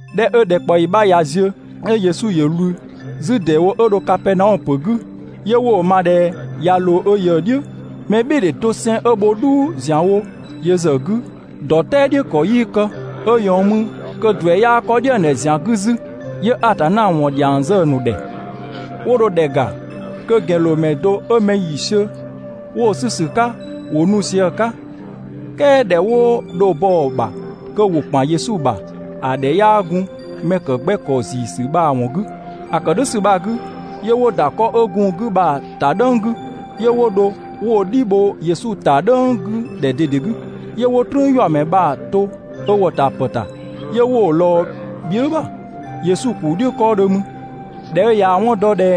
꞊Dhɛ 'ö ‑dhɛkpaɔyi 'bha ꞊ya ziö, 'yö Yesu ‑yö ꞊wlü 'zü ‑deewo 'ö dho Kapɛɛnaɔmö ‑pö 'gü. 'Yö 'wo‑ ma ꞊dhɛ ꞊ya ꞊loo ö ꞊yëë "dhiʋ̈. Mɛbhɩɩdhe doseng 'ö bho "dhuu ‑zianwo yö ‑zë 'gü, ‑dɔ "tɛɛ "dhiʋ̈ ‑kɔ 'yii kë, 'ö ꞊yɔɔn mü kö ‑duɛ 'yaa 'kɔ "dhiëngdhɛ ‑zian 'gü 'zü, 'yö Atanna ‑wɔn ‑dhiang zë‑ ‑nu ‑dhɛ. 'Wo dho ‑dhɛ ‑ga kö ‑gɛnloomɛ do 'ö mɛ ‑yiisiö 'wo‑ 'sü ‑sü 'ka, ‑wo nu sië‑ 'ka. "Kɛɛ ‑dhɛ 'wo dho bɔ‑ ‑bha kö ‑wo ‑kpan Yesu ‑bha, ‑a ‑dhɛ 'yaa gun mɛ ‑kë 'gbɛ ‑kɔ ‑ziisü bha‑ ‑wɔn 'gü. ‑A ‑kë "dhʋ̈ ‑sü bha‑ 'gü, 'yö 'wo ‑da 'kɔ 'ö gun‑ 'gü bha‑ ‑ta "dhʋ̈ng 'gü, 'yö 'wo dho 'wo‑ "dhi bho Yesu ‑ta "dhʋ̈ng 'gü ‑dhɛ ꞊dede 'gü. 'Yö 'wo "trüünyuamɛ bha‑ to ö ‑wɔtapë ‑ta, 'yö 'wo‑ ꞊lɔɔ bhië" ‑bha Yesu ‑kuu "dhiʋ̈ 'kɔɔdhö mü ꞊Dhɛ 'ö ꞊yaa‑ 'wɔn dɔ ꞊dhɛ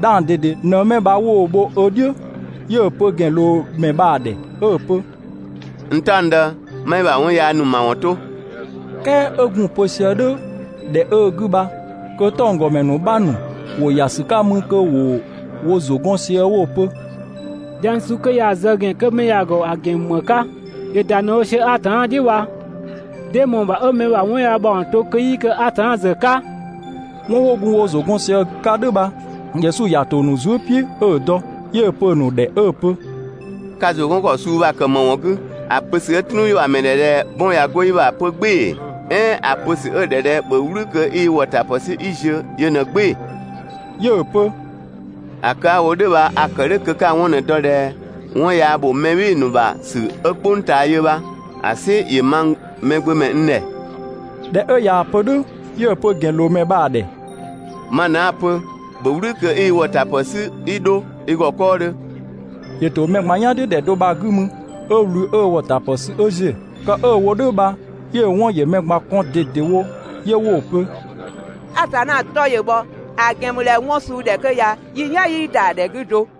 'dhang ꞊dede ꞊në 'mɛ bha 'wo‑ bho ö "dhiʋ̈, 'yö‑ pö ‑gɛnloomɛ bha‑ ‑dhɛ 'ö‑ pö: «N "taɔngdë, 'ma i ‑bha 'wɔn yaa ‑nu ‑mawɔn 'to!» "Kɛɛ 'ö gun‑ pö sië "dhʋ̈ ‑dhɛ 'ö‑ 'gü bha kö 'tɔnggɔmɛ ‑nu 'bha ‑nu ‑wo ‑ya ‑sü 'ka mü kö ‑wo wo ‑zʋ gɔn sië 'wo‑ pö: «Dhiang suu 'kö ya‑ zë ‑gɛn 'kö 'mɛ ya‑ ‑gɔ ‑a ‑gɛn ‑mü ‑më 'ka? ‑Yö ‑da ꞊në‑ wo sië Atanna "dhiʋ̈ bha. 'Dee ꞊mɔɔ‑ ‑bha 'ö mɛ ‑bha 'wɔn yaa ‑mawɔn to kö 'yii kë Atanna ‑zë 'ka?» 'Wɔn 'wo gun wo ‑zʋ 'gɔn sië 'ka "dhʋ̈ bha, Yesu ‑ya ‑to ‑a ‑nu zuë" "piʋ̈ 'ö‑ dɔ, 'yö‑ pö‑ nu ‑dhɛ 'ö‑ pö: «Ka ‑zʋ 'gɔn ‑kɔ suu bha‑ kë ‑më ‑wɔn 'gü? ‑A pö ‑sü 'ö "trüünyuamɛ ‑dhɛ ꞊dhɛ «'bɔn ꞊ya 'go i ‑bha!» 'pö "gbɩɩ‑ ‑ee? "Ɛɛn ‑a pö ‑sü 'ö‑ ‑dhɛ ꞊dhɛ ‹‑bhö "wlü kö 'i i ‑wɔtapë 'sü 'kii ziö!› yö ꞊në "gbɩɩ‑?» 'Yö‑ pö: «‑A kë 'a‑ wo "dhʋ̈ bha a‑ ‑kë "dhʋ̈ kö 'ka‑ 'wɔn ꞊në‑ dɔ ꞊dhɛ 'wɔn yaa ‑bho mɛ "bhɩɩ‑ ‑nu ‑bha ‑sü 'ö "kpʋng ꞊taa yö bha‑ "sɩ ‑yö mang Mɛgbömɛ n ‑dhɛ.» ꞊Dhɛ 'ö ꞊yaa‑ pö "dhʋ̈, 'yö‑ pö ‑gɛnloomɛ bha‑ ‑dhɛ: «Ma ꞊në 'a‑ pö, ‑bhö "wlü kö 'i i ‑wɔtapë 'sü 'i 'dho i ‑gɔ 'kɔɔdhö!» ‑Yö ‑to mɛ ꞊gban "yan "dhiʋ̈ ‑dhɛ do bha‑ 'gü mü 'ö ꞊wlü 'ö ö ‑wɔtapë sü 'ö ‑ziö. Kë 'ö‑ wo "dhʋ̈ bha 'yö‑ 'wɔn ‑yö mɛ ꞊gban kɔn ꞊dedewo, 'yö 'wo‑ pö: «Atanna 'tɔ ‑yö bhɔ, ‑a ‑gɛn ‑mü ꞊dhɛ 'wɔn suu 'dhɛ 'kö ya, yi "yan 'yii ‑da ‑dhɛ 'gü do!»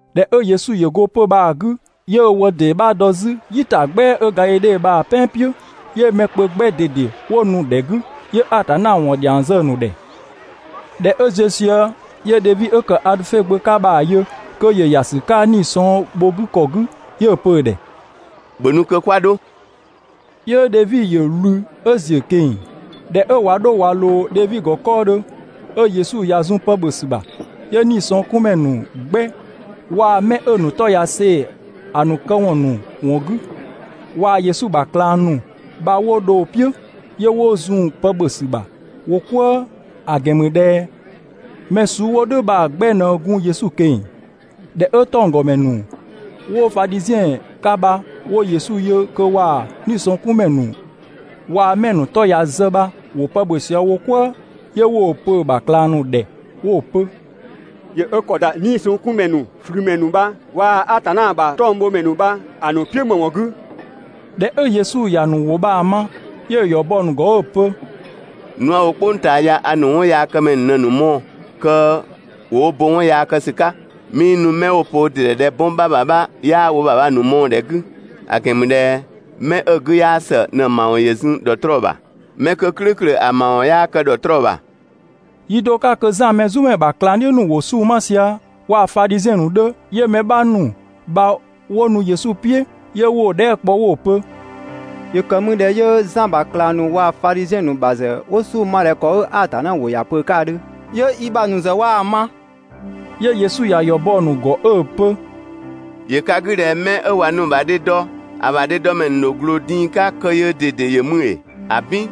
꞊Dhɛ 'ö Yesu ‑yö go 'pö‑ bha‑ 'gü, 'yö ö wë ‑dee 'bha dɔ 'zü "yitagbɛa 'ö Gadhidhe bha‑ "pɛan "piʋ̈. 'Yö mɛ kpö 'gbɛ ꞊dede 'wo nu‑ ‑dhɛ 'gü, 'yö Atanna ‑wɔn ‑dhiang zë‑ ‑nu ‑dhɛ. ꞊Dhɛ 'ö ziö sië, 'yö Dhevi 'ö ‑kë Adhöfe gbö 'ka bha‑ yö kö ‑yö ‑ya ‑sü 'ka 'nii‑ sɔng bho‑ 'gü ‑kɔ 'gü, 'yö‑ pö‑ ‑dhɛ: «‑Bhö nu kö 'kwa 'dho!» 'Yö Dhevi ‑yö ꞊wlü 'ö ‑ziö ꞊keng‑. ꞊Dhɛ 'ö ꞊wa 'dho ꞊wa ꞊loo Dhevi ‑gɔ 'kɔɔdhö, 'ö Yesu ꞊ya zun pë ‑bhö ‑sü ‑bha, 'yö 'niisɔngkunmɛ ‑nu 'gbɛ waa‑ mɛ 'ö‑ ‑nu 'tɔ ꞊ya see‑ ‑a ‑nu këwɔn ‑nu ‑wɔn 'gü, waa‑ Yesu ‑bha ꞊klang ‑nu bha 'wo dho‑ "piʋ̈, 'yö 'wo zun pë ‑bhö ‑sü ‑bha wo "kwëë, ‑a ‑gɛn ‑mü ꞊dhɛ mɛ suu 'wo "dhʋ̈ bha‑ 'gbɛ ꞊në gun Yesu ꞊keng‑. ꞊Dhɛ 'ö 'tɔnggɔmɛ ‑nu 'wo Fadhiziɛn 'ka bha 'wo Yesu yö kö waa‑ 'niisɔngkunmɛ ‑nu waa‑ 'mɛ‑ ‑nu 'tɔ ꞊ya zë bha ‑wo pë ‑bhö sië wo "kwëë, 'yö 'wo‑ pö‑ ‑bha ꞊klang ‑nu ‑dhɛ 'wo‑ pö: «‑Yö 'ö ‑kɔ ‑da 'niisɔngkunmɛ ‑nu, ꞊flümɛ ‑nu bha waa‑ Atanna ‑bha 'tɔngbhomɛ ‑nu bha‑ ‑nu "piʋ̈ ‑më ‑wɔn 'gü?» ꞊Dhɛ 'ö Yesu ‑ya ‑nu ‑wʋ bha‑ ma, 'yö‑ ‑yɔ bɔ‑ ‑nu ‑gɔ 'ö‑ pö: «Nu 'a‑ wo "kpʋng ꞊taa ya a ‑nu 'wɔnyaakëmɛ ‑nu ꞊në‑ ‑nu mɔɔ‑ kö ‑wo wo bo 'wɔn yaa kë ‑sü 'ka, 'mii nu 'mɛ 'wo‑ pö wo ‑dɩ ‑dhɛ ꞊dhɛ 'bɔn 'bha ‑bha 'bha 'yaa wo ‑bha bha‑ ‑nu mɔɔ‑ ‑dhɛ 'gü, ‑a ‑gɛn ‑mü ꞊dhɛ 'mɛ 'ö‑ 'gü 'yaa ‑së ꞊në‑ ‑mawɔn ‑yö zun ‑dhɔtrɔɔ ‑bha. ('Mɛ 'kö "klʋ̈ʋ̈klʋ̈ ‑a ‑mawɔn 'yaa kë ‑dhɔtrɔɔ ‑bha.)» Yi do 'ka kö Zan Mɛzumɛ ‑bha ꞊klangdhiʋ̈ ‑nu ‑wo 'sunng‑ 'ma sië, waa‑ Fadhiziɛn ‑nu 'dhö, 'yö mɛ 'bha ‑nu bha 'wo nu Yesu "piʋ̈, 'yö 'wo‑ dhɛɛ" kpɔ 'wo‑ pö: «‑Yö ‑kë mü ꞊dhɛ 'yö Zan ‑bha ꞊klang ‑nu waa‑ Fadhiziɛn ‑nu ‑bha ‑nu ‑zë 'wo 'sunng‑ ma ꞊dhɛ ‑kɔ 'ö Atanna ‑wʋ ‑ya pö‑ 'ka ‑a 'dhö, 'yö i ‑bha ‑nu ‑zë 'waa‑ 'ma?» 'Yö Yesu ‑ya ‑yɔ bɔ‑ ‑nu ‑gɔ 'ö‑ pö: «‑Yö ka 'gü ꞊dhɛ 'mɛ 'ö ꞊wa nu‑ ‑bha dhe dɔ, ‑a ‑bha dhedɔmɛ ‑nu ‑dho ꞊gloo din‑ 'ka kö yöö ꞊dede ‑yö mü ‑ee? ‑Abin!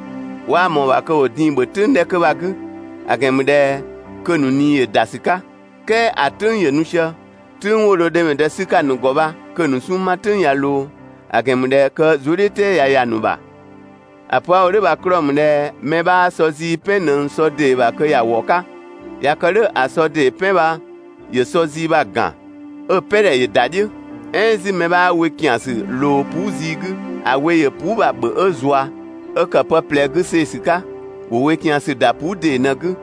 'Waa ꞊mɔɔ‑ ‑bha kö ‑wo din‑ "dhiʋ̈ "tʋ̈ng 'dhɛ 'kö bha‑ 'gü, (‑a ‑gɛn ‑mü ꞊dhɛ kö‑ ‑nu ꞊nii ‑yö ‑da ‑sü 'ka). "Kɛɛ ‑a "tʋ̈ng ‑yö nu sië, "tʋ̈ng 'wo dho dhemɛdë 'sü‑ 'ka ‑a ‑nu ‑gɔ bha kö‑ ‑nu 'sunng‑ 'ma "tʋ̈ng ꞊ya ꞊loo, (‑a ‑gɛn ‑mü ꞊dhɛ kö zuëdhiʋ̈tɛɛ ꞊ya ‑ya ‑nu ‑bha). ‑A pö 'a‑ wo "dhʋ̈ bha‑ 'klɔɔ‑ ‑mü ꞊dhɛ mɛ 'bhaa sɔ zii "pɛn ꞊nëng sɔ ‑dee ‑bha kö ‑wa ‑wɔ 'ka, ꞊ya kë "dhʋ̈ ‑a sɔ ‑dee "pɛn bha ‑yö sɔ zii bha‑ ‑gan, 'ö‑ "pɛ ‑dhɛ ‑yö ‑da "dhiʋ̈. "Ɛɛn 'zü mɛ 'bhaa we ‑kiansü ꞊loo puu" zii 'gü, ‑a we ‑yö puu" bha‑ ‑bhö 'ö zua, 'ö ‑kë pë ꞊plɛ 'gü see‑ ‑sü 'ka. ‑Wo we ‑kiansü ‑da puu" ‑dee ꞊në‑ 'gü.»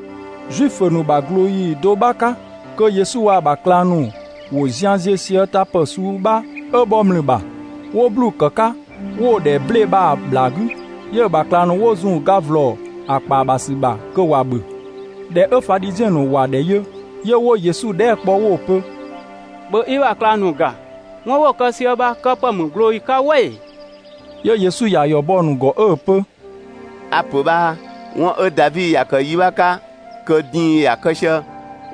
Zuifö ‑nu ‑bha ꞊glooyi do 'bha 'ka, kö Yesu waa‑ ‑bha ꞊klang ‑nu ‑wo zian ziö sië tapë suu 'bha 'ö bhɔ ‑mlü ‑bha, 'wo 'bluu‑ ‑kë 'ka, 'wo‑ ‑dhɛ 'ble‑ bha‑ ‑bhlaa 'gü. 'Yö‑ ‑bha ꞊klang ‑nu 'wo zun‑ ga ‑vlɔ ‑a ‑kpaa ‑bha ‑sü ‑bha kö ‑wa ‑bhö. ꞊Dhɛ 'ö Fadhiziɛn ‑nu ‑wa ‑dhɛ yö, 'yö 'wo Yesu dhɛɛ" kpɔ 'wo‑ pö: «‑Bhö i ‑bha ꞊klang ‑nu ‑ga! 'Wɔn 'wo‑ kë sië bha kë ‑pë ‑mü ꞊glooyi 'ka "wɛ ‑ee?» 'Yö Yesu ‑ya ‑yɔ bɔ‑ ‑nu ‑gɔ 'ö‑ pö: «A‑ ‑pö bhaa, 'wɔn 'ö Davi ‑ya ‑kë yi 'bha 'ka kö din‑ ‑ya kë sië,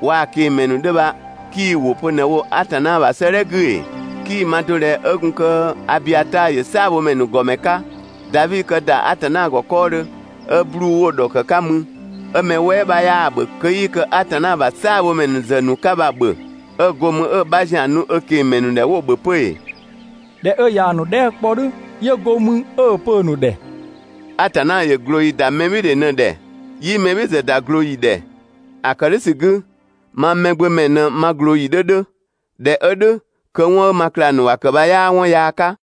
waa‑ ꞊kengmɛ ‑nu 'dhö bha 'kii‑ ‑wʋ pö ꞊në‑ wo do Atanna ‑bha 'sëëdhɛ 'gü ‑ee? 'Kii‑ ma do ‑dhɛ 'ö gun kö Abiataa ‑yö "saabhomɛ ‑nu ‑gɔmɛ 'ka, Davi kë ‑da Atanna ‑gɔ 'kɔɔdhö 'ö 'bluu‑ 'wo‑ ‑dhɔkë 'ka mü, 'ö mɛ "wɛɛ 'bha 'yaa‑ ‑bhö kö 'yii kë Atanna ‑bha "saabhomɛ ‑nu ‑zë ‑nu 'ka bha‑ ‑bhö, 'ö go mü 'ö‑ 'bha ‑zian nu ö ꞊kengmɛ ‑nu ‑dhɛ 'wo‑ ‑bhö 'pö ‑ee?» ꞊Dhɛ 'ö ꞊yaa‑ ‑nu dhɛɛ" 'kpɔ "dhʋ̈, 'yö go mü 'ö‑ pö‑ ‑nu ‑dhɛ: «Atanna ‑yö ꞊glooyi ‑da mɛbhɩɩdhe ꞊në ‑dhɛ, 'yii mɛ "bhɩɩ‑ ‑zë ‑da ꞊glooyi ‑dhɛ. ‑A ‑kë "dhʋ̈ ‑sü 'gü, mang Mɛgbömɛ ꞊në ma ꞊glooyi 'dhö 'dhö, (꞊dhɛ 'ö "dhʋ̈, kö 'wɔn 'ö ma ꞊klang ‑nu ‑wa ‑kë bha 'yaa 'wɔn yaa 'ka).»